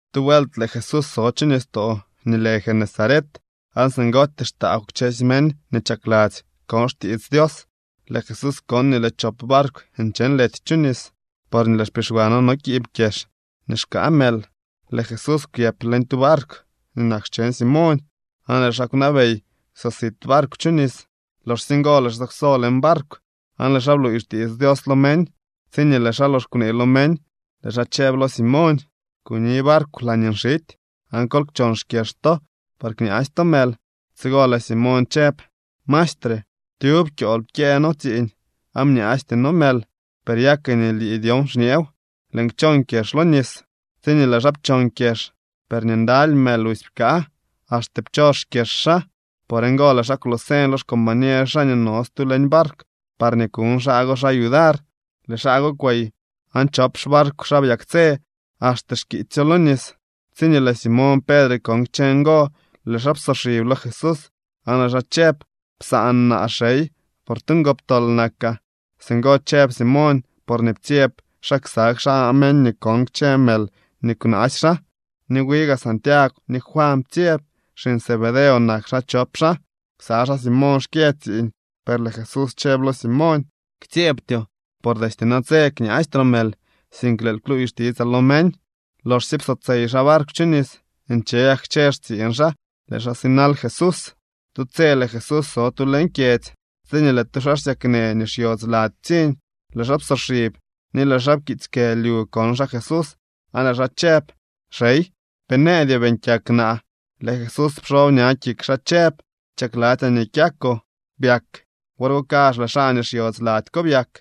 Tu vuelt lëë Jesús so chu nistoo nii lë Genesaret, aan singootyee xtaagw kchësy meñ nii chakladzy kon xtiits Dios. Lëë Jesús kon nii lëë chop barkw nche nlety chu nis, porñee lëë xpixwano no kiib kyex nii xkaa mël. Lëë Jesús kwyëp leñ tu barkw nii nak xcheñ Simoñ, aan lëë xaa kwnabey kwsosit barkw chu nis. Loxsye ngo lëë xaa kwsob leñ barkw aan lëë xaa bluuy xtiits Dios lo meñ. Tsiñee lëë xaa lox kwnee lo meñ, lëë xaa chëb lo Simoñ: —Kuni barkw laañee nxity, aan kol kchon xkyex to par kñaasy to mël. Tsigo lëë Simoñ chëb: —Maestre, tyub kyool pkyëë noo tsiiñ, aan bñaasty noo mël. Per ya ke nii lii dyon xñeew, lëën kchon kyex lo nis. Tsiñee lëë xaa pchon kyex, per nii ndaly mël busy pkaa, axte pchos xkyex xaa. Por ngo lëë xaa kwloo señ lo xcombañer xaa nii no stu leñ barkw parñee kuñ xaa go xaa yudar. Lëë xaa go kwey aan chop xbarkw xaa byaktsë axte xkiitsyo lo nis. Tsiñee lëë Simoñ Pedre kon kchë ngo, lëë xaa psoxib lo Jesús aan lëë xaa chëb: —Psaan naa, xey, por tu ngoptol nakaa. Singo chëb Simoñ porñee ptsyeb xaa ksa xaa meñ nii kon kchë mël nii kwnaasy xaa. Ni wi gaa Santiagw ni Juan ptsyeb. Xiñ Zebedeo nak xaa chop xaa. Ksa xaa Simoñ xkyë tsiiñ. Per lëë Jesús chëb lo Simoñ: —Ktsyeebtyoo. Por destye natse kñaastroo mël, sink lëël kluuy xtitsaa lo meñ. Loxsye psotsey xaa barkw chu nis, nche gak kchë xtsiiñ xaa, lëë xaa sinal Jesús. Tu tse lëë Jesús so tu leñ kyedzy, tsiñee lëë tu xaa xsyaknë nii xyodz lady ptsiñ. Lëë xaa psoxib ni lëë xaa pkiitsy kë lyu kon xaa Jesús, aan lëë xaa chëb: —Xey, pe nëëdyoo beeñ kyak naa. Lëë Jesús pxob ña kik xaa chëb: —Chakladzyaa nii kyakoo. Byak. Wor go kazh lëë xaa nii xyodz lady ko byak.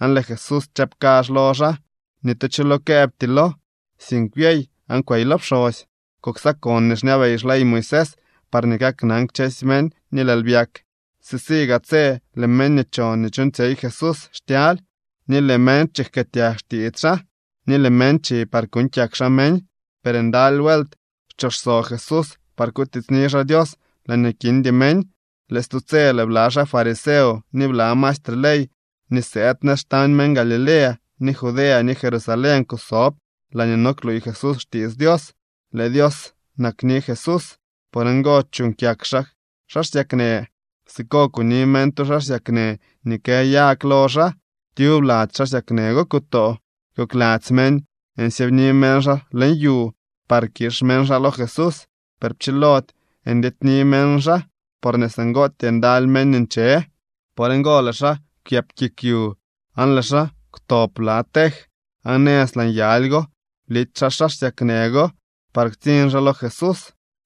Aan lëë Jesús chëb kazh lo xaa: —Ni tu cho lo këëbtylo, sink byey aan kwey lo pxosy. Kuksakon nii xñabey xley Moisés parñee kaknan kchësy meñ nii lëël byak. Sisi gaa tse lëë meñ nii chon nii chuuñtsyey Jesús xtyaly, ni lëë meñ chijkëëtyag xtiits xaa, ni lëë meñ chi par kuuñ kyak xaa meñ. Per ndaly vuelt xchooxso Jesús par kutiitsni xaa Dios laañee kindy meñ. Lëë stu tse lëë bla xaa fariseo ni bla maestre ley nii sëëd nëz xtañ meñ Galilea, ni Judea ni Jerusalén kusob laañee no kluuy Jesús xtiits Dios. Lëë Dios nakni Jesús. Por ngo chuuñ kyak xaa xaa xsyaknë. Siko kuni meñ tu xaa xsyaknë nii kë yag lo xaa. Tyub lady xaa xsyaknë go kutoo. Kokladzy meñ nsyëëbni meñ xaa leñ yu par kix meñ xaa lo Jesús. Per pchilody ndyedyni meñ xaa, porñee singootyee ndaly meñ nche. Por ngo lëë xaa kwyëp kik yu, aan lëë xaa kwtob bla tej, aan nëz laa nyaly go blity xaa xaa xsyaknë go par ktsiñ xaa lo Jesús.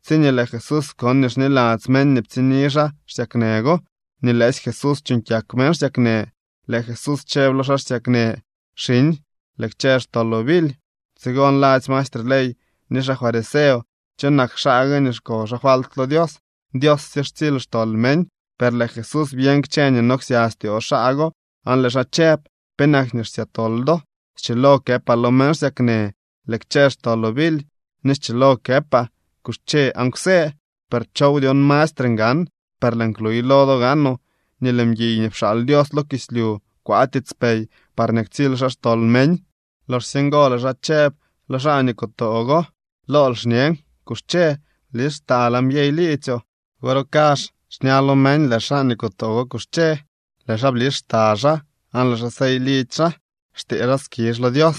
Tsiñee lëë Jesús kon nii xniladzy meñ nii ptsiñni xaa xsyaknë go nii lëësy Jesús chuuñ kyak meñ xsyaknë, lëë Jesús chëb lo xaa xsyaknë: —Xiñ, lëë kchë xtoloo bily. Tsigo nladzy maestre ley ni xaa fariseo: “¿Cho nak xaa gue nii xko xaa falt lo Dios? Dios sye xtsily xtol meñ.” Per lëë Jesús byeñ kchë nii no ksya styoo xaa go aan lëë xaa chëb: —¿Penak nii xsya tol do? Schilo këpaa lo meñ xsyaknë: “Lëë kchë xtoloo bily”, ni schilo këpaa: “Kuxche aan kwsë”, per ¿chow dyon mastre ngan? Per lëën kluy lo do gaanoo nii lëë mguiy nii pxaal Dios lo kislyu kwaa tiitspey parñee ktsily xaa xtol meñ. Loxsye ngo lëë xaa chëb lo xaa nii kutoo go: —Lool xñen, kuxche, blis xtal aan byey liidzyoo. Wor go kazh xña lo meñ lëë xaa nii kutoo go kuxche, lëë xaa blis xta xaa, aan lëë xaa sey lidzy xaa, xtee xaa skizh lo Dios.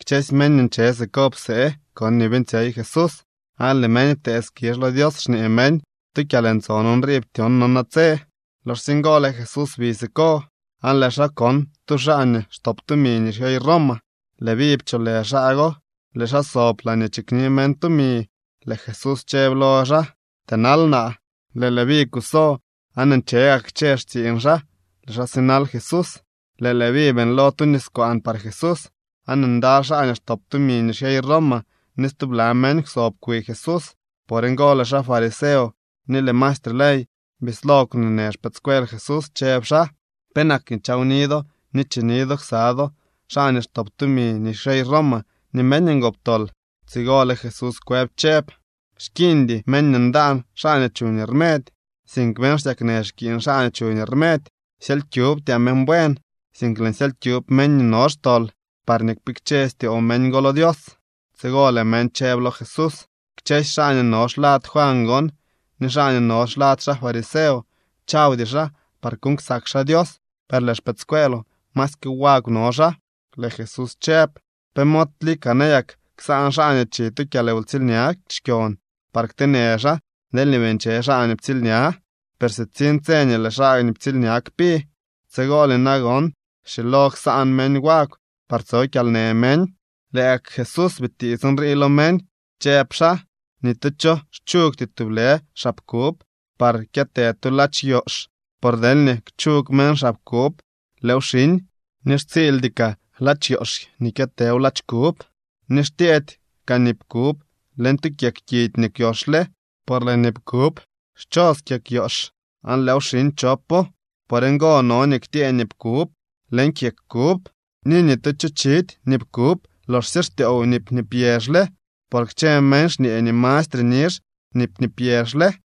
Kchësy meñ nii nche siko psee kon nii beeñtsyey Jesús, aan lëë meñ ptee skizh lo Dios xñee meñ: —Tu kyalntson nrii ptyon no natse. Loxsye ngo lëë Jesús bi siko, aan lëë xaa kon tu xaa nii xtop tumi nii xyey Roma. Leví pcholë xaa go. Lëë xaa sob laañee chikni meñ tumi. Lëë Jesús chëb lo xaa: —Tënal naa. Lëë Leví kuso, aan nche gak kchë xtsiiñ xaa, lëë xaa sinal Jesús. Lëë Leví beeñlo tu niskwaan par Jesús. Aan ndaly xaa nii xtop tumi nii xyey Roma ni stubla meñ kwsob kwi Jesús. Por ngo lëë xaa fariseo ni lëë maestre ley bislo kwneenë xpëëdscuel Jesús, chëb xaa: —¿Penak nii chawni do ni chini do ksa do xaa nii xtop tumi nii xyey Roma ni meñ ngoptol? Tsigo lëë Jesús kwëb chëb: —Xkiiñdy meñ nii ndaan xaa nii chuñ rmedy, sink meñ xsyaknë xkiiñ xaa nii chuñ rmedy. Syely kyubtyaa meñ buen, sink lëën syely kyub meñ nii no xtol parñee kpikche styoo meñ go lo Dios. Tsigo lëë meñ chëb lo Jesús: —Kchësy xaa nii no xlad Juan gon ni xaa nii no xlad xaa fariseo chawdy xaa par kuuñ ksak xaa Dios, per lëë xpëëdscueeloo masyke wagw no xaa. Lëë Jesús chëb: —¿Pe mod lika nayak ksaan xaa nii chi tu kyalwtsiilña xkyon par kteenë xaa deelñee bii nche xaa nii ptsiilña? Per sitsiñ tse nii lëë xaa ptsiilña kpi. Tsigolye nagon schilo ksaan meñ wagw par tso kyalnë meñ. Lëë gak Jesús bitiits nrii lo meñ, chëb xaa: —Ni tu cho xchugty tublë xab kub par kyëtë tu ladx yoox, por deelñee kchug meñ xab kub, lëëw xiñ, ni xtsiildy kaa ladx yoox nii kyëtëw ladx kub. Ni xtyëëdy kaa nip kub leñ tu kyeg kidy nii kwyoxle, por lëë nip kub xchos kyeg yoox, aan lëëw xiñ chopo. Por ngo no nii ktyëë nip kub leñ kyeg kub. Ni ni tu cho chidy nip kub loxsye xtyoow nip nii pyexle, por kchë meñ xñee nii mastre nizh nip nii pyexle.